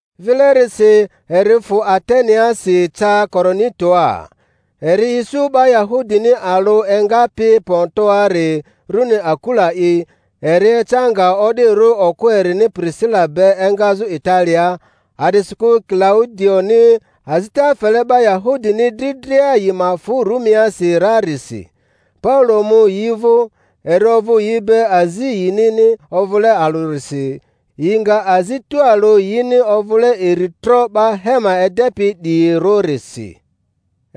Vilerisi eri fᴜ Ateneasi, ca Korintoa. Eri isu 'ba Ya-hudini alᴜ engapi Pontoari rᴜni Akula'i, eri eca nga o'dirᴜ okᴜ erini Pirisila be engazᴜ Italiaa, a'disikᴜ Kilaudioni azita fele 'ba Yahudini dri dria yi ma fᴜ Rumiasi rarisi. Paulo mu yi vᴜ; eri ovᴜ yi be azi yinini ovᴜle alᴜrisi, yi nga azi tualᴜ yini ovᴜle iri tro 'ba hema edepi 'diyirᴜrisi.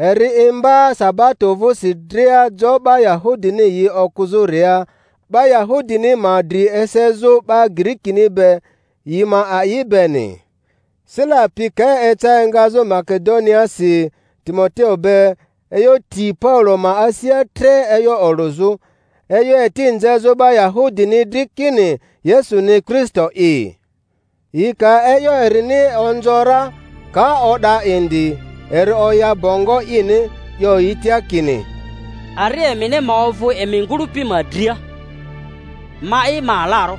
Eri imba sabato vᴜsi dria jo 'ba Yahudini yi okᴜzᴜ-ria, 'ba Yahudini ma dri esezᴜ 'ba Girikini be, yi ma a'i beni. Sila pi ka eca engazᴜ Make-doniaasi Timoteo be, e'yo ti Paulo ma asia tre e'yo olᴜzᴜ, e'yo eti nzezᴜ 'ba Yahudini dri kini Yesuni Kristo'i. Yi ka e'yo erini onzo ra, ka o'da indi, eri oya bongo ini, 'yo yi tia kini, Ari emini ma ovᴜ emi ngᴜlᴜpi dria! Ma'i, ma alarᴜ.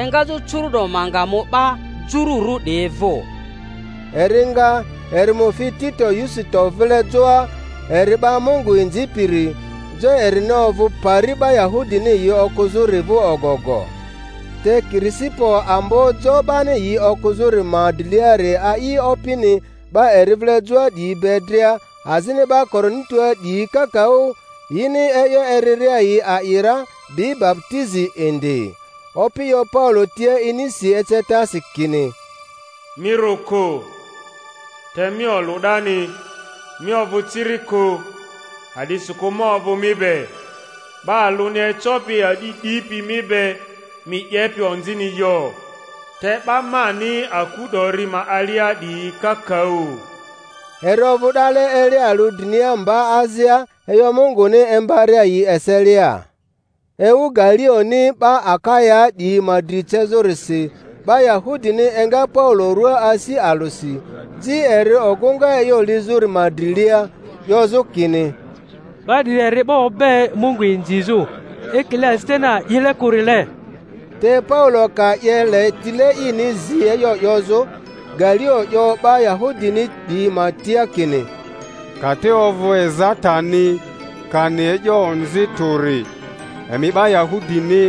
Engazᴜ curu'do ma nga mu 'ba Jururᴜ 'diyi vᴜ. Eri nga, eri mu fi Tito Yusito vile joa, eri 'ba Mungu inzipiri; jo erini ovᴜ pari 'ba Yahudini yi okᴜzᴜri vᴜ ogogo. Te Kirisipo ambo jo 'bani yi okᴜzᴜri ma driliari a'i Opini, 'ba eri vile joa 'diyi be dria; azini 'ba Korintoa 'diyi kakaᴜ, yini e'yo eriria yi a'i ra, bi baputizi indi. Opi 'yo Paulo tia inisi ecetasi kini, Mi rᴜ kᴜ, te mi olᴜ 'dani, mi ovᴜ ciri kᴜ; a'disikᴜ ma ovᴜ mi be, 'ba alᴜni ecopi a'di 'dipi mi be mi 'yepi onzini yo; te 'ba mani aku 'dori ma alia 'diyi kakaᴜ. Eri ovᴜ 'dale eli alᴜ drinia mba azia, e'yo Munguni imbaria yi eselia. Ewu Galioni 'ba Akayaa 'diyi ma dri cezᴜrisi, 'ba Yahudini enga Paulo rᴜaa asi alᴜsi, ji eri ogᴜŋa e'yo lizᴜri ma drilia, 'yozᴜ kini, 'Ba 'diri eri 'ba obe Mungu inzizᴜ. ekile azitani a'ile kᴜrile. Te Paulo ka 'ye le tile ini zi e'yo 'yozᴜ, Galio 'yo 'ba Yahudini 'diyi ma tia kini, Ka te ovᴜ ezatani kani e'yo onzi tᴜri, emi 'ba Yahudini,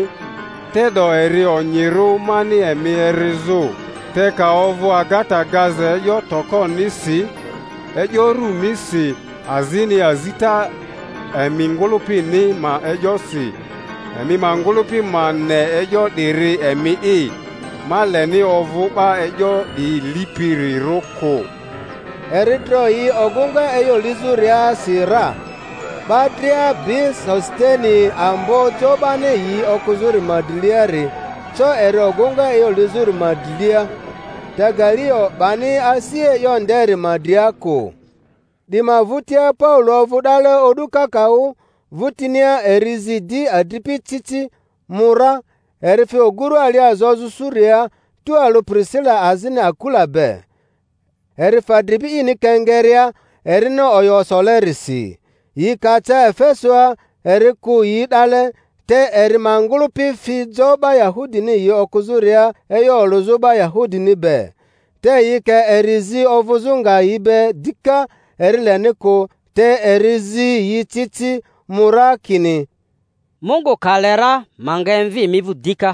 te'do eri onyirᴜ mani emi erizᴜ; te ka ovᴜ agata gaza e'yo tokonisi, e'yo runisi azini azita emi ngᴜlᴜpini ma e'yosi, emi ma ngᴜlᴜpi ma ne e'yo 'diri emi'i; ma leni ovᴜ 'ba e'yo 'diyi lipirirᴜ kᴜ. Eri dro yi ogᴜŋa e'yo lizᴜriasi ra. 'Ba dria bi Sositene, ambo jo 'bani yi okᴜzᴜri ma driliari, co eri ogᴜŋa e'yo lizᴜri ma drilia. Te Galio 'bani asi e'yo nderi ma dria kᴜ. 'Di ma vᴜtia Paulo ovᴜ 'dale o'du kakaᴜ, vᴜtinia eri zi di adripi ci ci, mu ra, eri fi ogurᴜ alia zozᴜ Suriaa tualᴜ Pirisila azini Akula be. Eri fa dribi ini Kenkereaa, erini oyo solerisi. Yi ka ca Efesoa eri kᴜ yi 'dale; te eri ma ngᴜlᴜpi fi jo 'ba Yahudini yi okᴜzᴜria e'yo olᴜzᴜ 'ba Yahudini be. Te yi ka eri zi ovᴜzᴜ nga yi be dika, eri leni kᴜ; te eri zi yi ci ci, mu ra, kini, Mungu ka le ra ma nga emvi emi vᴜ dika.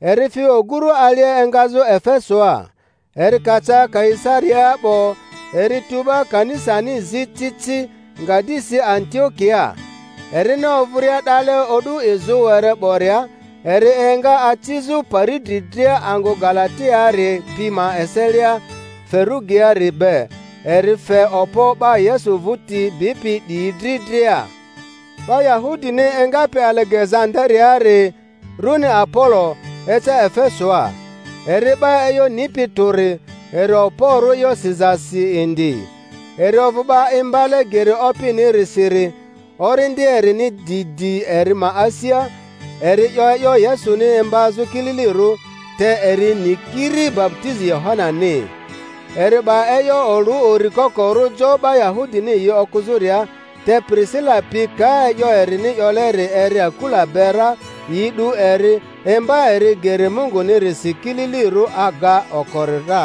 Eri fi ogurᴜ alia engazᴜ Efesoa. Eri ka ca Kaisariaa 'bo, eri tu 'ba kanisani zi ci ci, nga di si Antio-kiaa. Erini ovᴜria 'dale o'du izᴜ were 'boria, eri enga acizᴜ pari dri dria angᴜ Galatiaari pi ma eselia Ferugiaari be, eri fe okpo 'ba Yesu vᴜti bipi 'diyi dri dria. 'Ba Yahudini engapi AIege-zandariaari, rᴜni Apolo, eca Efesoa. Eri 'ba e'yo nipi tᴜri, eri okporᴜ e'yo sizasi indi. Eri ovᴜ 'ba imbale geri Opinirisiri; orindi erini di di eri ma asia, eri 'yo e'yo Yesuni imbazᴜ kililirᴜ, te eri ni kiri baputizi Yohanani. Eri 'ba e'yo olᴜ uri kokorᴜ jo 'ba Yahudini yi okᴜzᴜria; te Pirisila pi ka e'yo erini 'yoleri eri Akula be ra, yi 'du eri, imba eri geri Mungunirisi kililirᴜ aga okori ra.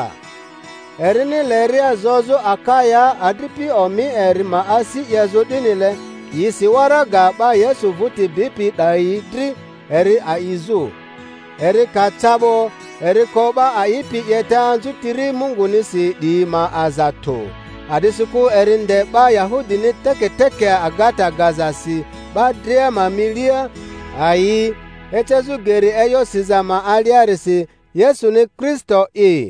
Erini leria zozᴜ Akayaa, adripi omi eri ma asi 'yezᴜ 'dinile, yi si waraga 'ba Yesu vᴜti bipi 'dayi dri eri a'izᴜ. Eri ka ca 'bo, eri ko 'ba a'ipi 'yeta anzutiri Mungunisi 'diyi ma aza tᴜ, a'disikᴜ eri nde 'ba Yahudini teketeke agata gazasi 'ba dria ma milia ayii, ecezᴜ geri e'yo siza ma aliarisi Yesuni Kristo'i.